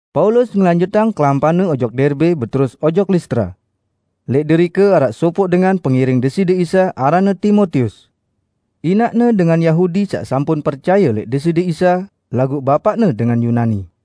Paulus ngelanjutang kelampanne ojok Derbe beterus ojok Listra. Lẽq derike araq sopoq dengan pengiring Deside Isa aranne Timotius. Inaqne dengan Yahudi saq sampun percaye lẽq Deside Isa; laguq bapaqne dengan Yunani.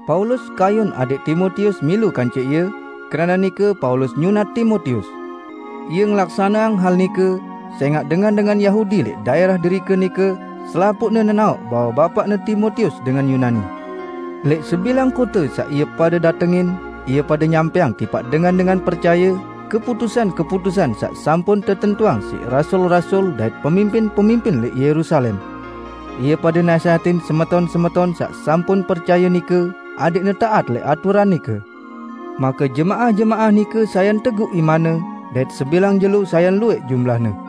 Paulus kayun adẽq Timotius milu kance ie; keranaq nike Paulus nyunat Timotius. Ie ngelaksaneang hal nike, sẽngaq dengan-dengan Yahudi lẽq daẽrah derike nike selapuqne nenaoq bahwe bapaqne Timotius dengan Yunani. Lẽq sebilang kote saq ie pade datengin, ie pade nyampẽang tipaq dengan-dengan percaye keputusan-keputusan saq sampun tetentuang siq rasul-rasul dait pemimpin-pemimpin lẽq Yerusalem. Ie pade nasẽhatin semeton-semeton saq sampun percaye nike adẽqne taat lẽq aturan nike. Make jemaah-jemaah nike sayan teguq imanne, dait sebilang jelo sayan luwẽq jumlahne.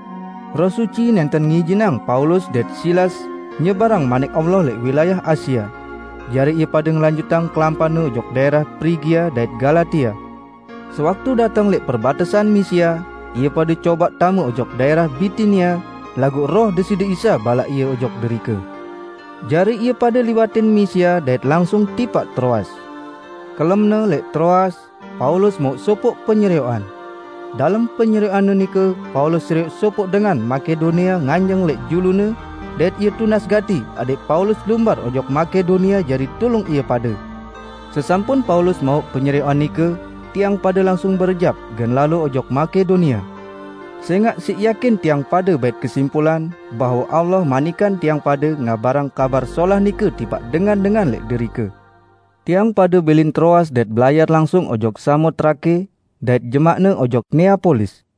Roh Suci nẽnten ngijinang Paulus dait Silas nyebarang Manik Allah lẽq wilayah Asia. Jari ie pade ngelanjutang kelampanne ojok daẽrah Prigia dait Galatia. Sewaktu dateng lẽq perbatesan Misia, ie pade cobaq tame ojok daẽrah Bitinia, laguq Roh Deside Isa balaq ie ojok derike. Jari ie pade liwatin Misia dait langsung tipaq Troas. Kelemne, lẽq Troas, Paulus mauq sopoq penyerioqan. Dalem penyerioqanne nike Paulus serioq sopoq dengan Makedonia nganjeng lẽq julune dait ie tunas gati adẽq Paulus lumbar ojok Makedonia jari tulung ie pade. Sesampun Paulus mauq penyerioqan nike, tiang pade langsung berejap gen lalo ojok Makedonia. Sẽngaq siq yakin tiang pade bait kesimpulan bahwe Allah manikang tiang pade ngabarang Kabar Solah nike tipaq dengan-dengan lẽq derike. Tiang pade bilin Troas dait belayar langsung ojok Samotrake, dait jemaqne ojok Neapolis.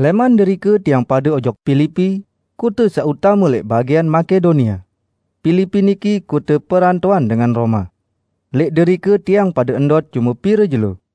Lẽman derike tiang pade ojok Pilipi, kote saq utame lẽq bagian Makedonia. Pilipi niki kote perantoan dengan Roma. Lẽq derike tiang pade ndot cume pire jelo.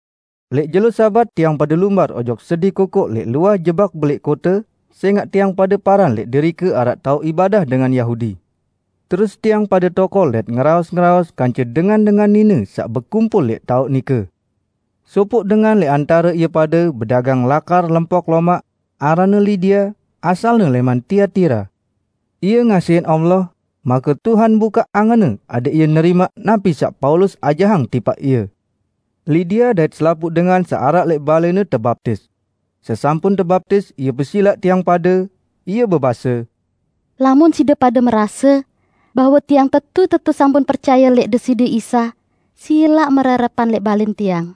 Lẽq jelo Sabat tiang pade lumbar ojok sedi kokoq lẽq luah jebak belẽq kote, sẽngaq tiang pade paran lẽq derike araq taoq ibadah dengan Yahudi. Terus tiang pade tokol dait ngeraos-ngeraos kance dengan-dengan nine saq bekumpul lẽq taoq nike. Sopoq dengan lẽq antare ie pade bedagang lakar lempok lomaq, aranne Lidia, asalne lẽman Tiatira. Ie ngasihin Allah, make Tuhan bukaq angenne adẽq ie nerimaq napi saq Paulus ajahang tipaq ie. Lidia dait selapuq dengan saq araq lẽq balẽne tebaptis. Sesampun tebaptis ie pesilaq tiang pade, ie bebase, "Lamun side pade merase bahwe tiang tetu-tetu sampun percaye lẽq Deside Isa, silaq mererepan lẽq balẽn tiang."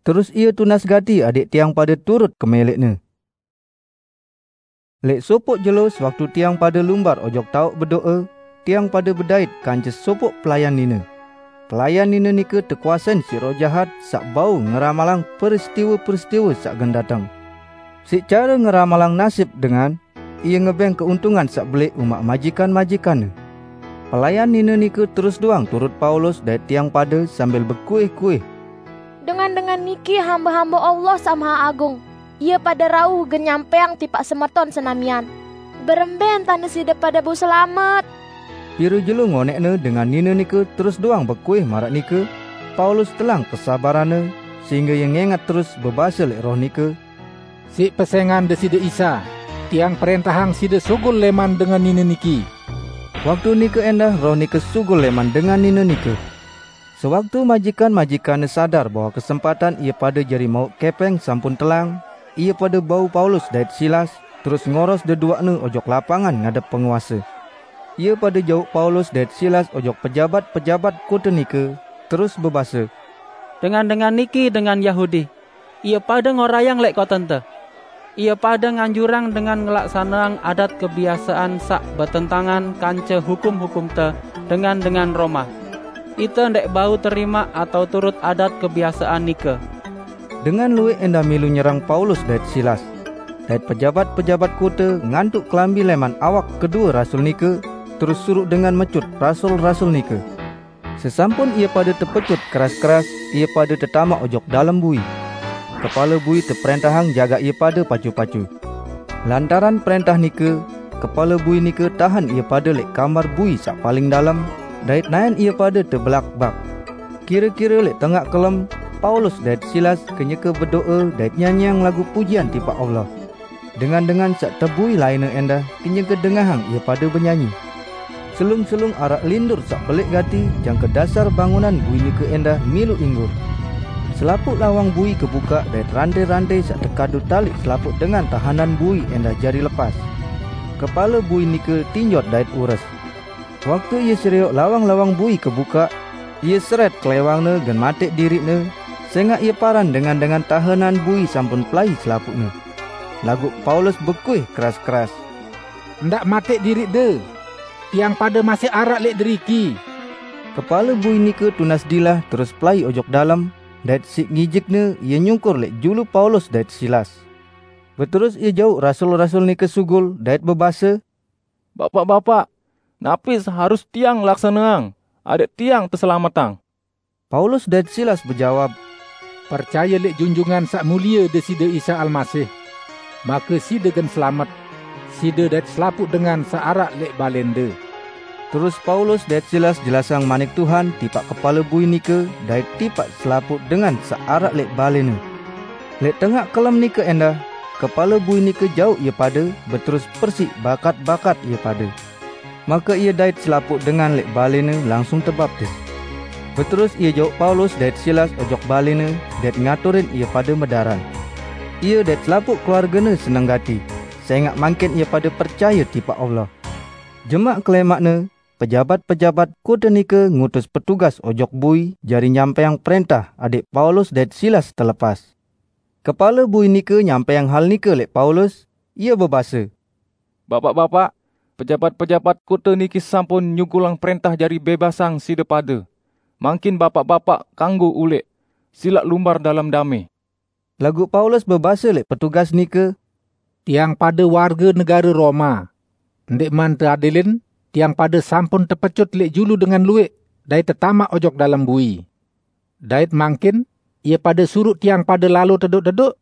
Terus ie tunas gati adẽq tiang pade turut kemẽlẽqne. Lẽq sopoq jelo sewaktu tiang pade lumbar ojok taoq bedo'e, tiang pade bedait kance sopoq pelayan nine. Pelayan nine nike tekuasein siq roh jahat saq bau ngeramalang peristiwe-peristiwe saq gen dateng. Siq care ngeramalang nasib dengan, ie ngebẽng keuntungan saq belẽq umaq majikan-majikanne. Pelayan nine nike terus doang turut Paulus dait tiang pade sambil bekuih-kuih, "Dengan-dengan niki hambe-hambe Allah Saq Maheagung! Ie pade rauh gen nyampẽang tipaq semeton senamian berembẽ entane side pade bau selamet!" Pire jelo ngonẽqne dengan nine nike terus doang bekuih maraq nike, Paulus telang kesabaranne, sehingge ie ngẽngat terus bebase lẽq roh nike, "Siq pesẽngan Deside Isa tiang prẽntahang side sugul lẽman dengan nine niki!" Waktu nike ẽndah roh nike sugul lẽman dengan nine nike. Sewaktu majikan-majikanne sadar bahwe kesempatan ie pade jari mauq kẽpẽng sampun telang, ie pade bau Paulus dait Silas, terus ngoros deduaqne ojok lapangan ngadep penguase Ie pade jauq Paulus dait Silas ojok pejabat-pejabat kote nike, terus bebase, "Dengan-dengan niki dengan Yahudi. Ie pade ngorayang lẽq kotente. Ie pade nganjurang dengan ngelaksaneang adat kebiasean saq betentangan kance hukum-hukumte, dengan-dengan Roma. Ite ndẽq bau terimaq atao turut adat kebiasean nike!" Dengan luwẽq ẽndah milu nyerang Paulus dait Silas; dait pejabat-pejabat kote ngantuq kelambi lẽman awak kedue rasul nike, terus suruq dengan mecut rasul-rasul nike. Sesampun ie pade tepecut keras-keras, ie pade tetamaq ojok dalem bui. Kepale bui teprẽntahang jagaq ie pade pacu-pacu. Lantaran prẽntah nike, kepale bui nike tahen ie pade lẽq kamar bui saq paling dalem, dait naẽn ie pade tebelakbak. Kire-kire lẽq tengaq kelem, Paulus dait Silas kenyeke bedo'e dait nyanyiang lagu pujian tipaq Allah. Dengan-dengan saq tebui lainne ẽndah kenyeke dengahang ie pade benyanyi. Selung-selung araq lindur saq belẽq gati jangke dasar bangunan bui nike ẽndah milu inggur. Selapuq lawang bui kebukaq dait rantẽ-rantẽ saq tekadu taliq selapuq dengan tahenan bui ẽndah jari lepas. Kepale bui nike tinjot dait ures. Waktu ie serioq lawang-lawang bui kebukaq, ie serẽt klẽwangne gen matẽq diriqne, sẽngaq ie paran dengan-dengan tahenan bui sampun pelai selapuqne. Laguq Paulus bekuih keras-keras, "Ndaq matẽq diriqde! Tiang pade masih araq lẽq deriki!" Kepale bui nike tunas dilah terus pelai ojok dalem, dait siq ngijikne ie nyungkur lẽq julu Paulus dait Silas. Beterus ie jauq rasul-rasul nike sugul, dait bebase, "Bapaq-bapaq, napi saq harus tiang laksaneang adẽq tiang teselametang?" Paulus dait Silas bejawab, "Percaye lẽq Junjungan Saq Mulie Deside Isa Almasih! Make side gen selamet -- side dait selapuq dengan saq araq lẽq balẽnde!" Terus Paulus dait Silas jelasang manik Tuhan tipaq kepale bui nike dait tipaq selapuq dengan saq araq lẽq balẽne. Lẽq tengaq kelem nike ẽndah, kepale bui nike jauq ie pade beterus persiq bakat-bakat ie pade. Make ie dait selapuq dengan lẽq balẽne langsung tebaptis. Beterus ie jauq Paulus dait Silas ojok balẽne, dait ngaturin ie pade medaran. Ie dait selapuq keluargene seneng gati, sẽngaq mangkin ie pade percaye tipaq Allah. Jemaq kelẽmaqne, pejabat-pejabat kote nike ngutus petugas ojok bui jari nyampẽang prẽntah adẽq Paulus dait Silas telepas. Kepale bui nike nyampẽang hal nike lẽq Paulus, ie bebase, "Bapaq-bapaq, pejabat-pejabat kote niki sampun nyugulang prẽntah jari bẽbasang side pade. Mangkin Bapaq-bapaq kanggo ulẽq. Silaq lumbar dalem damẽ!" Laguq Paulus bebase lẽq petugas nike, "Tiang pade warge negare Roma. Ndẽqman teadilin tiang pade sampun tepecut lẽq julu dengan luwẽq dait tetamaq ojok dalem bui. Dait mangkin ie pade suruq tiang pade lalo tedoq-tedoq?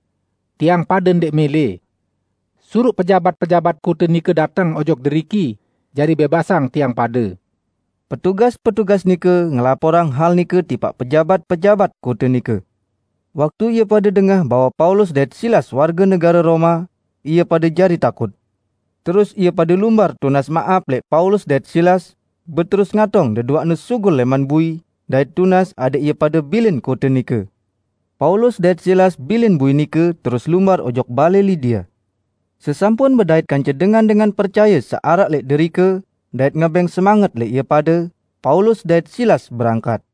Tiang pade ndẽq mẽlẽ! Suruq pejabat-pejabat kote nike dateng ojok deriki jari bẽbasang tiang pade." Petugas-petugas nike ngelaporang hal nike tipaq pejabat-pejabat kote nike. Waktu ie pade dengah bahwe Paulus dait Silas warge negare Roma, ie pade jari takut. Terus ie pade lumbar tunas maap lẽq Paulus dait Silas, beterus ngatong deduaqne sugul lẽman bui, dait tunas adẽq ie pade bilin kote nike. Paulus dait Silas bilin bui nike terus lumbar ojok balẽ Lidia. Sesampun bedait kance dengan-dengan percaye saq araq lẽq derike, dait ngebẽng semanget lẽq ie pade, Paulus dait Silas berangkat.